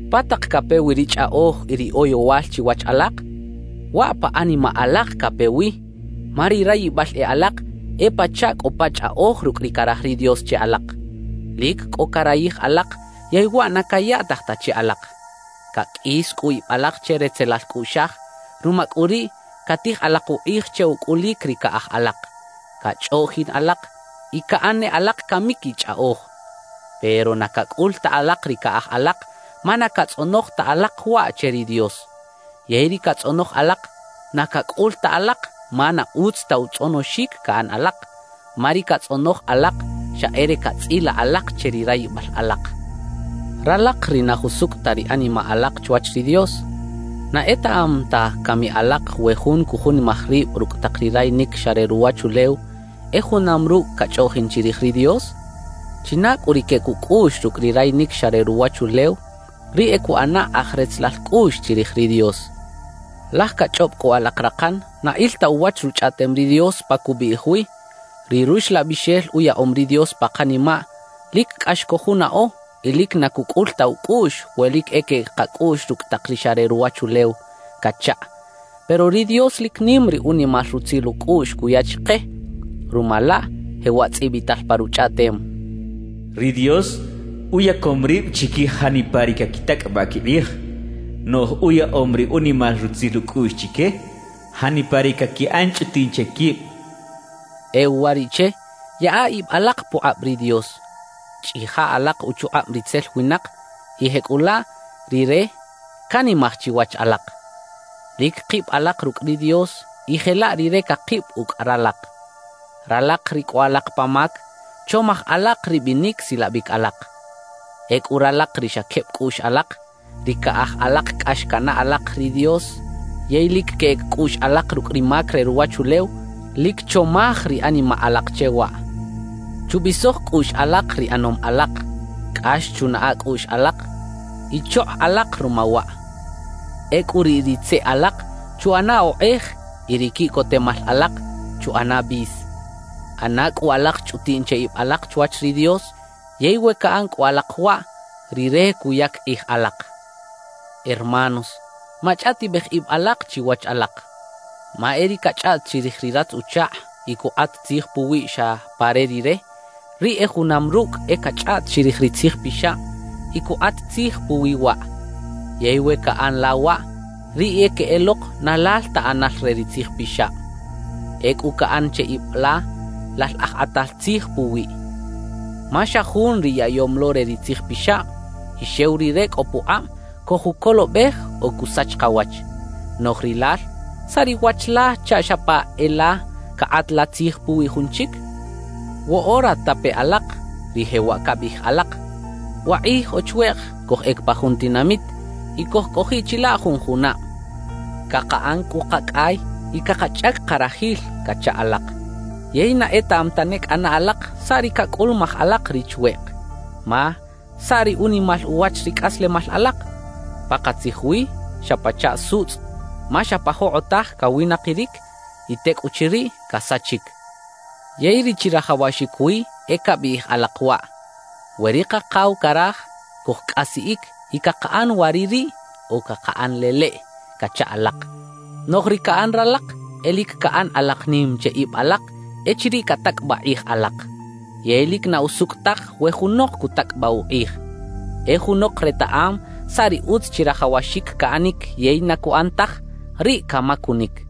¿Pa tak cape wi ri chꞌaꞌoj y ri oyowal chiwach alak? Waꞌ pa animaꞌ alak cape wi, ma ri rayibal e alak e pachaꞌ cꞌo pa chꞌaꞌoj rucꞌ ri caraj ri Dios che alak. Lic cꞌo carayij alak yey waꞌ na cayaꞌtaj ta che alak. Caqꞌuis cꞌu ib alak che retzelal cꞌuꞌxaj; ruma cꞌu riꞌ catij alak ukꞌij che ucꞌulic ri caꞌaj alak, cachꞌoꞌjin alak y caꞌan ne alak camic y chꞌaꞌoj. Pero na cacꞌul ta alak ri caꞌaj alak ma na catzꞌonoj ta alak waꞌ che ri Dios. Yey ri catzꞌonoj alak, na cacꞌul ta alak ma na utz ta utzꞌonoxic caꞌan alak. Ma ri catzꞌonoj alak xa e re catzꞌilaꞌ alak che ri rayibal alak. Ralak ri na jusucꞌ ta ri animaꞌ alak chwach ri Dios, ¿na etaꞌam ta cami alak we jun cujunimaj rib rucꞌ tak ri rayinic xa re ruwachulew, e junam rucꞌ cachꞌoꞌjin chirij ri Dios? China cꞌu ri queꞌec ucꞌuꞌx rucꞌ ri rayinic xa re ruwachulew, riꞌ e cuꞌana aj retzelal cꞌuꞌx chirij ri Dios. Laj cachꞌob cꞌu alak rakan na il ta uwach Ruchꞌaꞌtem ri Dios pa cubiꞌij wi: «Ri Ruxlabixel uyaꞌom ri Dios pa kanimaꞌ lic cꞌax cojunaꞌo y lic na cucꞌul ta ucꞌuꞌx we lic e queꞌec kacꞌuꞌx rucꞌ tak ri xa re ruwachulew» cachaꞌ. Pero ri Dios lic nim ri unimal rutzil ucꞌuꞌx cuya chike. Ruma laꞌ jewaꞌ tzꞌibital pa Ruchꞌaꞌtem: Ri Dios uyacom rib chiquij janipa ri caquitacꞌabaꞌ quikꞌij; noꞌj uyaꞌom ri unimal rutzil ucꞌuꞌx chique janipa ri caquiꞌan chꞌutiꞌn che quib cachaꞌ. E uwariꞌche, yaꞌa ib alak pukꞌab ri Dios; chꞌija alak uchukꞌab ritzel winak y jecꞌulaꞌ rire canimaj chiwach alak. Lic kib alak rucꞌ ri Dios y jelaꞌ Rire cakib ucꞌ ralak. Ralak ri cꞌo alak pa mac, chomaj alak ri binic silabic alak. Ecꞌu ralak ri xa queb cꞌuꞌx alak, ri caꞌaj alak cꞌax canaꞌ alak ri Dios yey lic queꞌec cꞌuꞌx alak rucꞌ ri mac re ruwachulew, lic chomaj ri animaꞌ alak che waꞌ. Chubisoj cꞌuꞌx alak ri ꞌanom alak, cꞌax chunaꞌa cꞌuꞌx alak y chokꞌ alak ruma waꞌ. Ecꞌu riꞌ ri tzeꞌ alak chuꞌana okꞌej y ri quiꞌcotemal alak chuꞌana bis. ꞌAna cꞌu alak chꞌutiꞌn che ib alak chwach ri Dios; yey we caꞌan cꞌu alak waꞌ, Rire cuyac kꞌij alak. Hermanos, machꞌaꞌtibej ib alak chiwach alak. Ma e ri cachꞌaꞌt chirij ri ratz-uchakꞌ y cukꞌat tzij puwiꞌ xa pa re rire, riꞌ e junam rucꞌ e cachꞌaꞌt chirij ri Tzij Pixab y cukꞌat tzij puwi waꞌ. Yey we caꞌan la waꞌ, riꞌ e queꞌelok na lal ta ꞌanal re ri Tzij Pixab; ecꞌu caꞌan che ib la lal aj kꞌatal tzij puwiꞌ. Ma xa Jun ri yaꞌyom lo re ri Tzij Pixab y xew Rire cꞌo pukꞌab cojucolobej o cusach kawach. Noꞌj rilal ¿saꞌ ri wach la chaꞌ xa pa e la cakꞌat la tzij puwi jun chic? Woꞌora tape alak, ri jewaꞌ cabiꞌij alak: «Wakꞌij o chweꞌk cojꞌec pa jun tinamit y cojcꞌojiꞌ chilaꞌ jun junab; cakaꞌan cꞌu kacꞌay y cakachꞌac karajil» cacha alak. Yey na etaꞌam tane cꞌana alak saꞌ ri cacꞌulumaj alak ri chweꞌk. Ma ¿saꞌ ri unimal uwach ri cꞌaslemal alak? Pakatzij wi, xa pachaꞌ sutzꞌ, ma xa pa jokꞌotaj cawinakiric y tecꞌuchiriꞌ casachic. Yey ri chirajawaxic wi e cabiꞌij alak waꞌ: «We ri Kakaw caraj, cojcꞌasiꞌic y cakaꞌan waꞌririꞌ o cakaꞌan leleꞌ» cacha alak. Noꞌj ri caꞌan ralak, e lic caꞌan alak nim che ib alak echiriꞌ catacꞌabaꞌ kꞌij alak. Yey lic na usucꞌ taj we junok cutacꞌabaꞌ ukꞌij. E junok retaꞌam saꞌ ri utz chirajawaxic caꞌanic yey na cuꞌan taj, riꞌ camacunic.